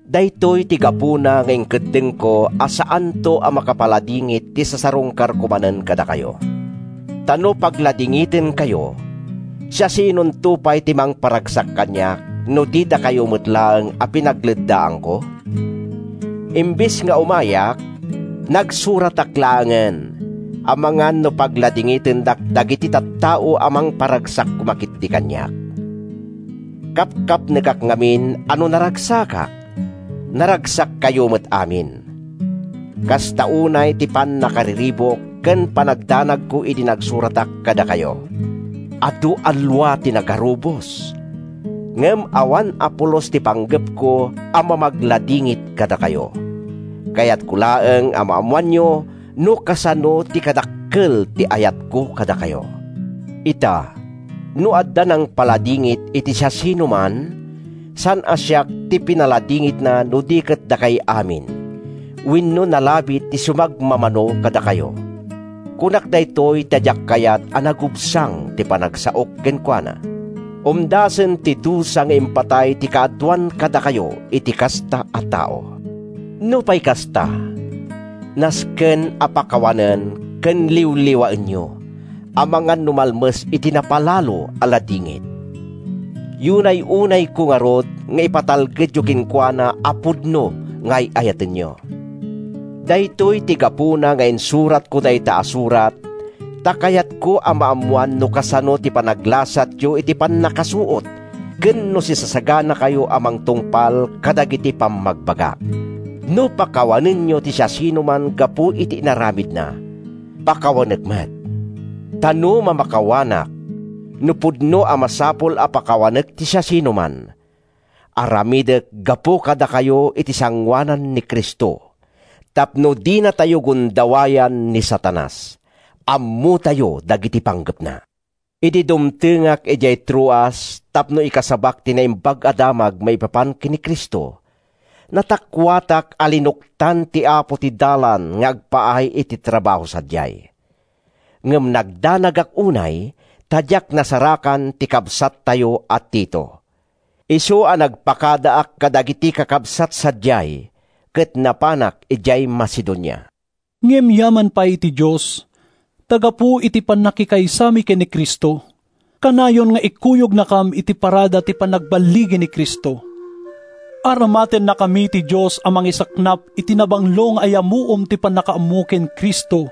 Daytoy ti gapuna nga inkeddengko a saanto a makapaladingit ti isasarungkarko manen kadakayo. Ta no pagladingitenkayo, siasinonto pay ti mangparagsak kaniak no di dakayo met laeng a pinagleddaangko? Imbes nga umayak, nagsuratak laengen amangan no pagladingitendak dagiti tattao a mangparagsak koma ketdi kaniak. Kapkapnekak ngamin a no naragsakak, naragsakkayo met amin. Kasta unay ti pannakariribuk ken panagdanagko idi nagsuratak kadakayo; adu a lua ti nagarubos! Ngem awan a pulos ti panggepko a mamagladingit kadakayo. Kayatko laeng a maammoanyo no kasano ti kadakkel ti ayatko kadakayo. Ita, no adda nangpaladingit iti siasinoman, saan a siak ti pinaladingitna no di dakay amin wenno nalabit ti sumagmamano kadakayo. (Kunak daytoy ta diak kayat a nagubsang ti panagsaok kenkuana.) Umdasen ti dusa nga impatay ti kaaduan kadakayo iti kasta a tao. Nupay kasta, nasken a pakawanen ken liwliwaenyo amangan no malmes iti napalalo a ladingit. Yunay-unayko ngarud nga ipatalgedyo kenkuana a pudno nga ay-ayatenyo. Daytoy ti gapuna nga insuratko dayta a surat ta kayatko a maammoan no kasano ti panaglasatyo iti pannakasuot ken no sisasaganakayo a mangtungpal kadagiti pammagbagak. No pakawanenyo ti siasinoman gapu iti inaramidna, pakawanek met. Ta no mamakawanak—no pudno a masapul a pakawanek ti siasinoman—aramidek gapu kadakayo iti sangoanan ni Cristo tapno dinatayo gundawayan ni Satanas. Ammotayo dagiti panggepna. Idi dumtengak idiay Troas tapno ikasabak ti Naimbag a Damag maipapan ken ni Cristo, natakuatak a linuktan ti Apo ti dalan nga agpaay iti trabaho sadiay. Ngem nagdanagak unay ta diak nasarakan ni kabsattayo a Tito. Isu a nagpakadaak kadagiti kakabsat sadiay, ket napanak idiay Macedonia. Ngem yaman pay iti Dios, ta gapu iti pannakikaysami ken ni Cristo, kanayon nga ikuyognakam iti parada ti panagballigi ni Cristo. Aramatennakami ti Dios a mangisaknap iti nabanglo nga ayamuom ti pannakaammo ken Cristo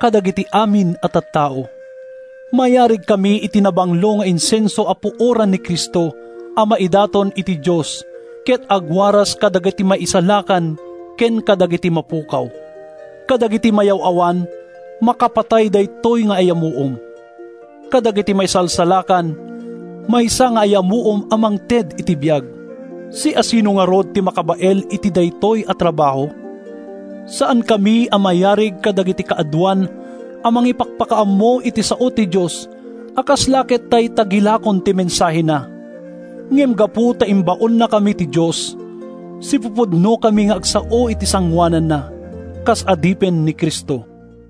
kadagiti amin a tattao. Mayarigkami iti nabanglo nga insenso a puoran ni Cristo a maidaton iti Dios ket agwaras kadagiti maisalakan ken kadagiti mapukaw. Kadagiti mayaw-awan, makapatay daytoy nga ayamuom. Kadagiti maisalsalakan, maysa nga ayamuom a mangted iti biag. Siasino ngarud ti makabael iti daytoy a trabaho? Saankami a mayarig kadagiti kaaduan a mangipakpakaammo iti sao ti Dios a kasla ket tay tagilakon ti mensahena. Ngem gapu ta imbaonnakami ti Dios, sipupudnokami nga agsao iti sangoananna, kas adipen ni Cristo.